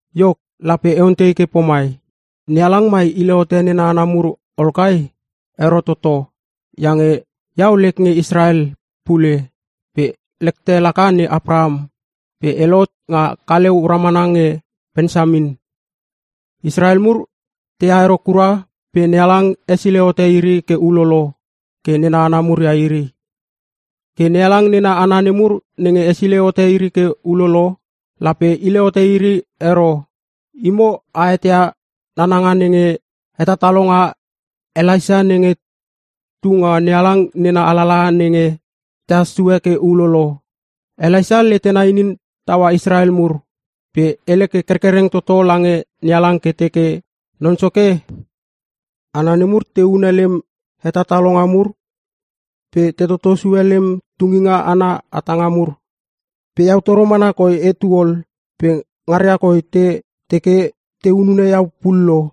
Iok, lape e ontei ke pomai: NeHalang mai hile hote nena hana mur ol kai? Ero toto! Iange iau lek nge Israel pule pe lekte laka ne Apraham pe e lohot nga kaleu ramana nge Pensamin. Israel mur teha ero kura pe NeHalang hesilei hote iri ke ulolo ke nena hana mur ia iri. Ke NeHalang nena hana nemur nenge hesilei hote iri ke ulolo, lape hile hote iri ero. Imo a eteia nananga nenge hetatalonga Elaisa nenge tu nga NeHalang nena alalaha nenge tehas sue ke ulolo. Elaisa letena inin taua Israel mur pe hele ke kerkereng toto lange NeHalang ke teke, “Non Soke, hana nemur te hune lem hetatalonga mur pe te toto sue lem tunginga ana hatanga mur. Pe iau toro mana koi etu ol pe ngaria koi te teke te hunune iau pullo.”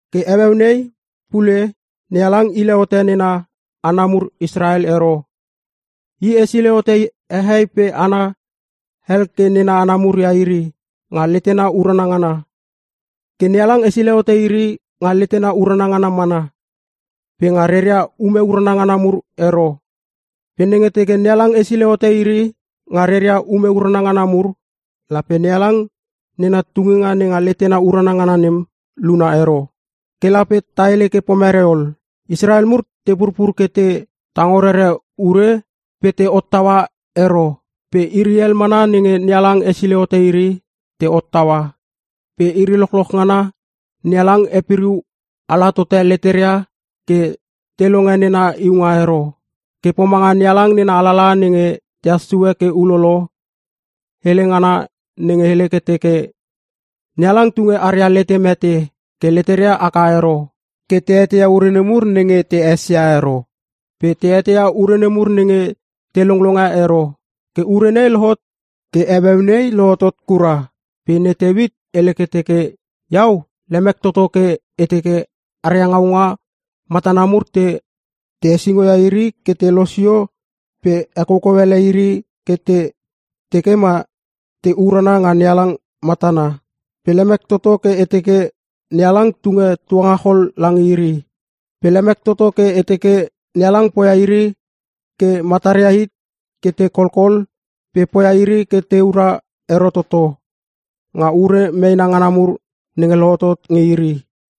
Ke heueu nei pule NeHalang hile hote nena hana mur Israel ero. I hesilei hote hehei pe hana hel ke nena hana mur ia iri nga letena urana ngana. Ke NeHalang hesilei hote iri nga letena urana ngana mana, pe nga reria ume urana ngana mur ero. Pe nenge teke NeHalang hesilei hote iri nga reria ume urana ngana mur, lape NeHalang nena tunginga nenga letena urana ngana nem luna ero. Ke lape ta hele ke pomerei ol? Israel mur te purpur ke te tango rere ure pe te hottaua ero pe iri hel mana nenge NeHalang hesilei hote iri te hottaua. Pe iri lochloch ngana NeHalang hepiriu ala tote leteria ke te longe nena iunga ero. Ke pomanga NeHalang nena alalaha nenge tehas sue ke ulolo, hele ngana nenge hele ke teke, “NeHalang tunge aria lete mete ke leteria haka ero, ke te eteia ure nemur nenge te esesia ero pe te eteia ure nemur nenge te longlonge ero. Ke ure nei lohotot ke heueu nei lohotot kura.” Pe ne Teuit hele ke teke, “Iau lemek toto ke e teke aria ngaunga matana mur te hesingo ia iri ke te losio pe ekoukou ele iri ke te tekema te urana nga NeHalang matana. Pe lemek toto ke e teke NeHalang tunge tuangachol lange iri. Pe lemek toto ke e teke NeHalang poia iri ke mataria hit ke te kolkol pe poia iri ke teura ero toto nga ure meena ngana mur nenge lohotot nge iri.”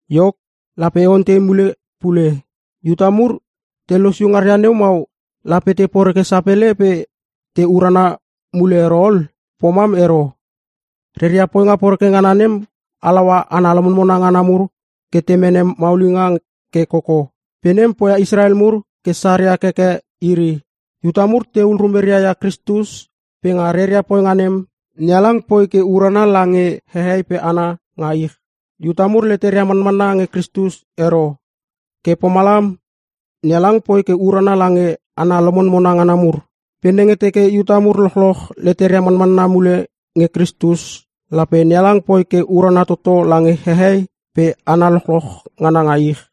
Iok, lape e ontei mule pule: Iuta mur te losio ngaria neu mau, lape te poreke sapele pe te urana mule ero ol? Pomam ero! Reria poinga poreke ngana nem halaua hana lomonmona ngana mur ke te mene maulinga ke koko, pe nem poia Israel mur ke saria keke iri. Iuta mur tehul rumeria ia Kristus pe nga reria poinga nem, NeHalang poi ke urana lange hehei pe hana nga ich. Iuta mur leteria manmanna nge Kristus ero, ke pomalam NeHalang poi ke urana lange hana lomonmona ngana mur. Pe nenge teke Iuta mur lochloch leteria manmanna mule nge Kristus, lape NeHalang poi ke urana toto lange hehei pe hana lochloch ngana nga ich!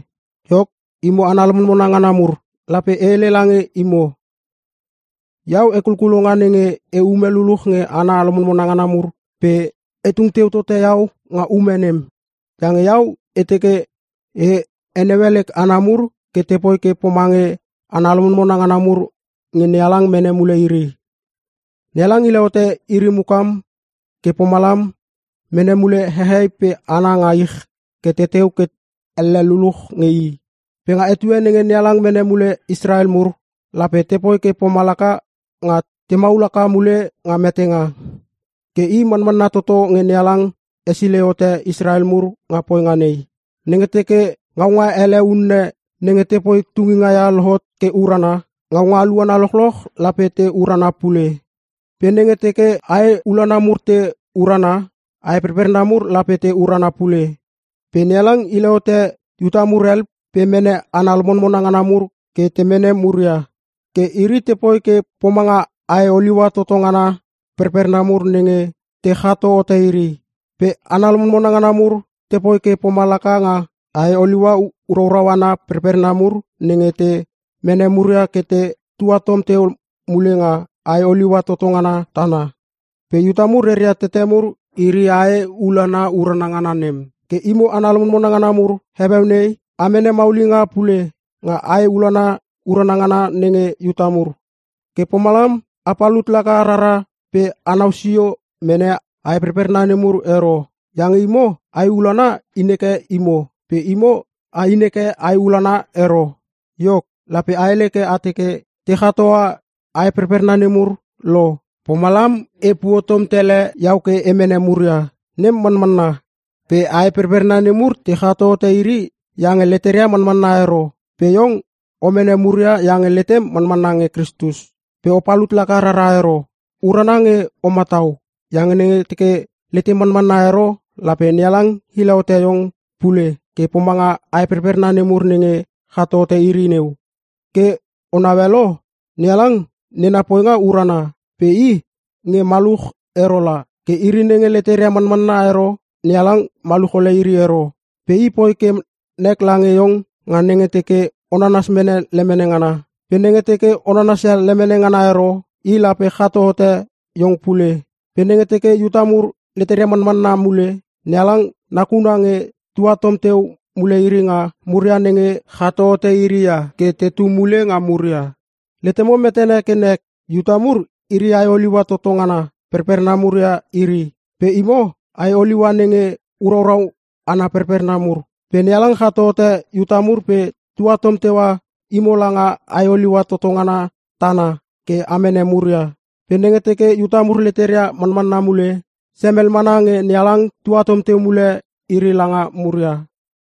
Iok, imo hana lomonmona ngana mur, lape e hele lange imo. Iau hekulkulonga nenge e ume luluch nge hana lomonmona ngana mur pe e tung teu tote iau nga ume nem. Iange iau e teke e heneue lek hana mur ke te poi ke pomange hana lomonmona ngana mur nge NeHalang mene mule iri. NeHalang hile hote iri mukam ke pomalam mene mule hehei pe hana nga ich ke tetu ke elle luluch nge i. Pe nga etue nenge NeHalang mene mule Israel mur, lape tepoi ke pomalaka nga te maul haka mule nga metenga. Ke i manmanna toto nge NeHalang hesilei hote Israel mur nga poinga nei. Nenge teke ngaunga ele unne nenge tepoi tunginga ia lohot ke urana, ngaunga aluana lochloch lape te urana pule. Pe nenge teke ae ulana mur te urana, ae perperna mur lape te urana pule. Pe NeHalang hile hote Iuta mur hel pe mene hana lomonmona ngana mur ke te mene muria. Ke iri tepoi ke pomanga ae oliua toto ngana perperna mur nenge te chato hote iri. Pe hana lomonmona ngana mur tepoi ke pomalaka nga ae oliua uraurau ana perperna mur nenge te mene muria ke te tuatom teu mule nga ae oliua toto ngana tana. Pe Iuta mur reria tete mur iri ae ulana urana ngana nem. Ke imo hana lomonmona ngana mur, heueu nei a mene maulinga pule nga ae ulana urana ngana nenge Iuta mur. Ke pomalam a palut laka rara pe anau sio mene ae perperna nemur ero. Iange imo ae ulana inheke imo pe imo a inheke ae ulana ero. Iok, lape a hele ke a teke, “Te chatoa ae perperna nemur lo pomalam e puotom tele iau ke e mene muria.” Nem manmanna. Pe ae perperna nemur te chato hote iri iange leteria manmanna ero pe iong o mene muria iange letem manmanna nge Kristus. Pe o palut laka rara ero. Urana nge o matau. Iange nenge teke letem manmanna ero lape NeHalang hile hote iong pule ke pomanga ae perperna nemur nenge chato hote iri neu. Ke o naue lo? NeHalang nena poinga urana pe i nge maluch ero la. Ke iri nenge leteria manmanna ero NeHalang maluch ole iri ero. Pe i poi ke nek lange iong nga nenge teke o nanasia mene lemene ngana. Pe nenge teke o nanasia lemene ngana ero, i lape chato hote iong pule. Pe nenge teke Iuta mur leteria manmanna mule, NeHalang nakuna nge tuatom teu mule iri nga muria nenge chato hote iri ia ke tetu mule nga muria. Letemo metene ke nek! Iuta mur iri ae oliua toto ngana perperna mur ia iri. Pe imo, ae oliua nenge uraurau ana perperna mur. Pe NeHalang chato hote Iuta mur pe tuatom teua imo langa ae oliua toto ngana tana ke a mene muria. Pe nenge teke Iuta mur leteria manmanna mule, semel mana nge NeHalang tuatom teu mule iri langa muria!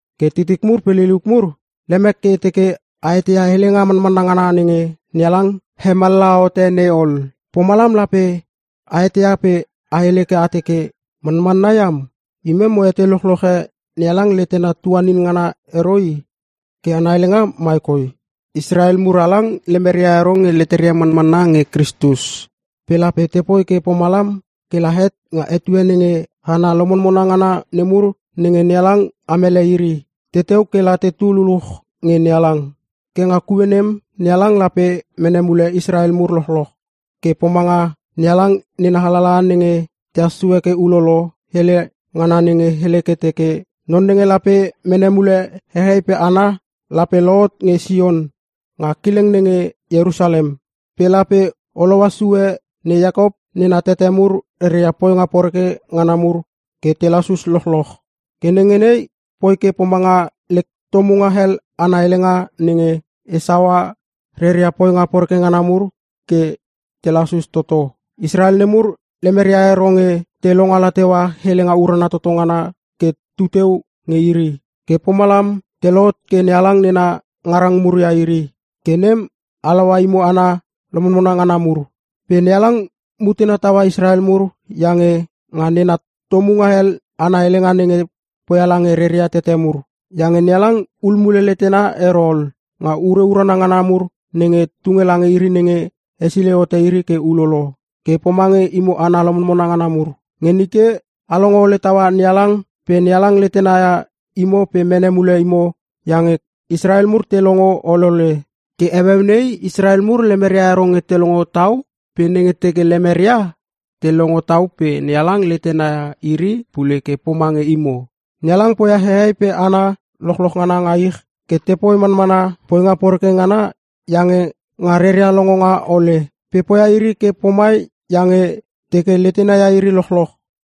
Ke titik mur pe liliuk mur, lemek ke e teke a eteia helenga manmanna ngana nenge NeHalang hemallaha hote nei ol. Pomalam lape a eteia pe a hele ke a teke, “Manmanna iam, imem mo etei lochloche NeHalang letena tuanin ngana ero i!” Ke ana helenga mai koi: Israel mur halang lemeria ero nge leteria manmanna nge Kristus. Pe lape tepoi ke pomalam kela het nga etue nenge hana lomonmona ngana nemur nenge NeHalang amele iri, teteu kela tetu luluch nge NeHalang. Ke nga kue nem NeHalang lape mene mule Israel mur lochloch. Ke pomanga NeHalang nena alalaha nenge tehas sue ke ulolo, hele ngana nenge hele ke teke, “Non nenge lape mene mule hehei pe hana lape lohot nge Sion nga kileng nenge Ierusalem. Pe lape holoa sue ne Iakop nena tete mur reria poinga poreke ngana mur ke te lasus lochloch. Ke nenge nei poi ke pomanga lek tomunga hel ana helenga nenge e saua reria poinga poreke ngana mur ke te lasus toto.” Israel nemur lemeria ero nge te longala teua helenga urana toto ngana ke tuteu nge iri, ke pomalam te lohot ke NeHalang nena ngarang mur ia iri, ke nem halaua imo hana lomonmona ngana mur. Pe NeHalang mutena taua Israel mur iange nga nena tomunga hel ana helenga nenge poia lange reria tete mur. Iange NeHalang hul mule letena ero ol nga ure urana ngana mur nenge tunge lange iri nenge hesilei hote iri ke ulolo. Ke pomange imo hana lomonmona ngana mur. Nge nike a longo ole taua NeHalang pe NeHalang letena ia imo pe mene mule imo iange Israel mur te longo olole. Ke heueu nei Israel mur lemeria ero nge te longo tau pe nenge teke lemeria, te longo tau pe NeHalang letena ia iri pule ke pomange imo. NeHalang poia hehei pe hana lochloch ngana nga ich ke tepoi manmana poinga poreke ngana iange nga reria longonga ole. Pe poia iri ke pomai iange teke letena ia iri lochloch.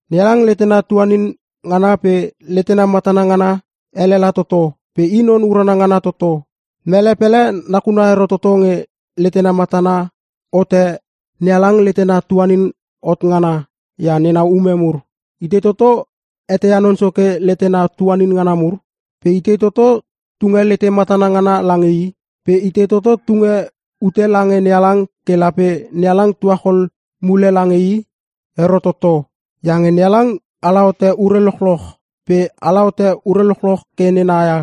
NeHalang letena tuanin ngana pe letena matana ngana elela toto pe i non urana ngana ia toto! Mele pele nakuna ero toto nge letena matana hote NeHalang letena tuanin hot ngana ia nena ume mur! “Itei toto eteia Non Soke letena tuanin ngana mur? Pe itei toto tunge lete matana ngana lange i?” “Pe itei toto tunge ute lange NeHalang ke lape NeHalang tuachol mule lange i?” Ero toto! Iange NeHalang ala hote ure lochloch pe ala hote ure lochloch ke nena ia,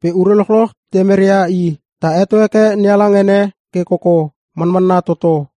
pe ure lochloch temeria i. Ta heto heke NeHalang ene ke koko! Manmanna toto.